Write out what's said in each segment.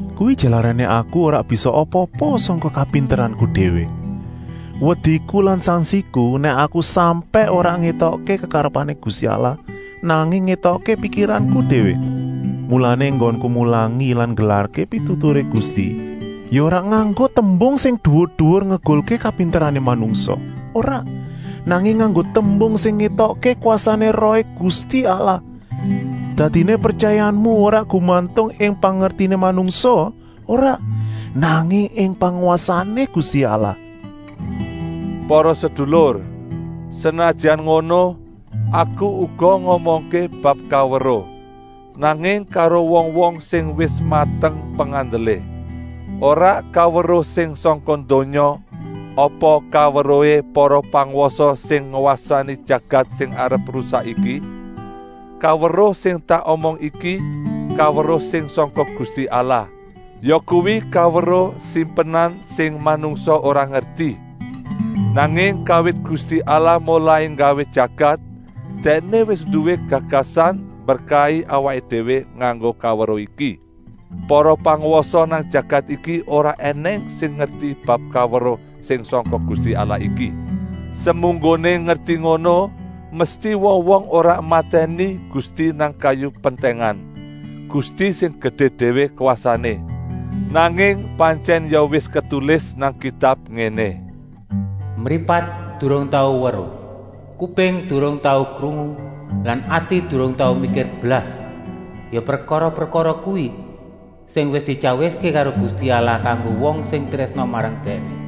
Kuwi jalarané aku ora bisa apa-apa sangka kapinteranku déwé. Wediku lan sangsiku nèk aku sampèk ora ngétokké kekarepané Gusti Allah, nanging ngétokké pikiranku déwé. Mulané enggonku mulangi lan nggelarké pituturé Gusti ya ora nganggo tembung sing duwur-duwur ngegulké kapinterané manungsa, ora, nanging nganggo tembung sing ngétokké kwasané Rohé Gusti Allah. Dadiné pretyayamu ora gumantung ing pangertiné manungsa, ora, nanging ing pangwasané Gusti Allah. Para sedulur, senajan ngono, aku uga ngomongké bab kaweruh, nanging karo wong-wong sing wis mateng pengandelé. Ora kaweruh sing sangka donya apa kaweruhé para pangwasa sing ngwasani jagat sing arep rusak iki. Kaweruh sing tak omong iki kaweruh sing sangka Gusti Allah, yakuwi kaweruh simpenan sing manungsa ora ngerti. Nanging kawit Gusti Allah molai nggawé jagat, Dèkné wis nduwé gagasan mberkahi awaké déwé nganggo kaweruh iki. Para pangwasa nang jagat iki ora ènèng sing ngerti bab kaweruh sing sangka Gusti Allah iki. Semunggoné ngerti ngono mesti wong-wong ora matèni Gusti nang kayu pentèngan, Gusti sing gedé déwé kwasané. Nanging pantyèn ya wis ketulis nang Kitab ngéné: “Mripat durung tau weruh, kuping durung tau krungu lan ati durung tau mikir blas, ya prekara-prekara kuwi sing wis dityawiské karo Gusti Allah kanggo wong sing trésna marang Dèkné.”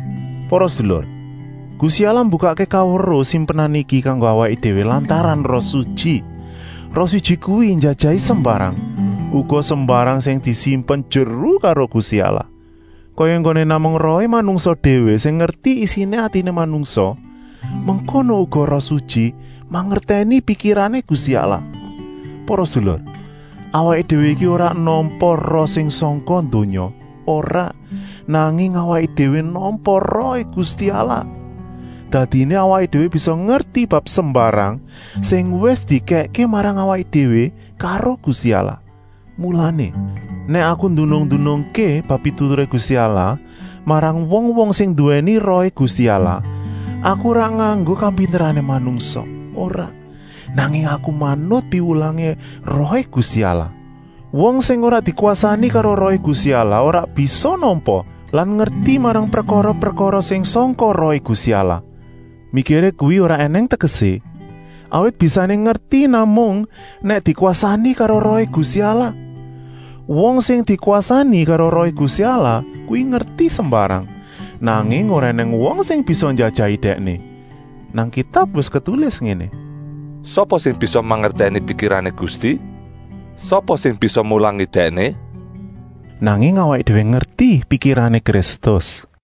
Para sedulur, Gusti Allah mbukakké kaweruh simpenan iki kanggo awaké déwé lantaran Roh Sutyi. Roh Sutyi kuwi njajahi sembarang, uga sembarang sing disimpen jeru karo Gusti Allah. Kaya enggoné namung rohé manungsa déwé sing ngerti isiné atiné manungsa, mengkono uga Roh Sutyi mangertèni pikirané Gusti Allah. Para sedulur, awaké déwé iki ora nampa roh sing sangka donya, ora, nanging awaké déwé nampa Rohé Gusti Allah. Dadiné awaké déwé bisa ngerti bab sembarang sing wis dikèkké marang awaké déwé karo Gusti Allah. Mulané, nèk aku ndunung-ndunungké bab pituturé Gusti Allah marang wong-wong sing nduwèni Rohé Gusti Allah, aku ora nganggo kapinterané manungsa, ora, nanging aku manut piwulangé Rohé Gusti Allah. Wong sing ora dikwasani karo Rohé Gusti Allah ora bisa nampa lan ngerti marang prekara-prekara sing sangka Rohé Gusti Allah. Mikiré kuwi ora ènèng tegesé, awit bisané ngerti namung nèk dikwasani karo Rohé Gusti Allah. Wong sing dikwasani karo Rohé Gusti Allah kuwi ngerti sembarang, nanging ora ènèng wong sing bisa njajahi dèkné. Nang Kitab wis ketulis ngéné: “Sapa sing bisa mangertèni pikirané Gusti? Sapa sing bisa mulangi Dèkné?” Nanging awaké déwé ngerti pikirané Kristus.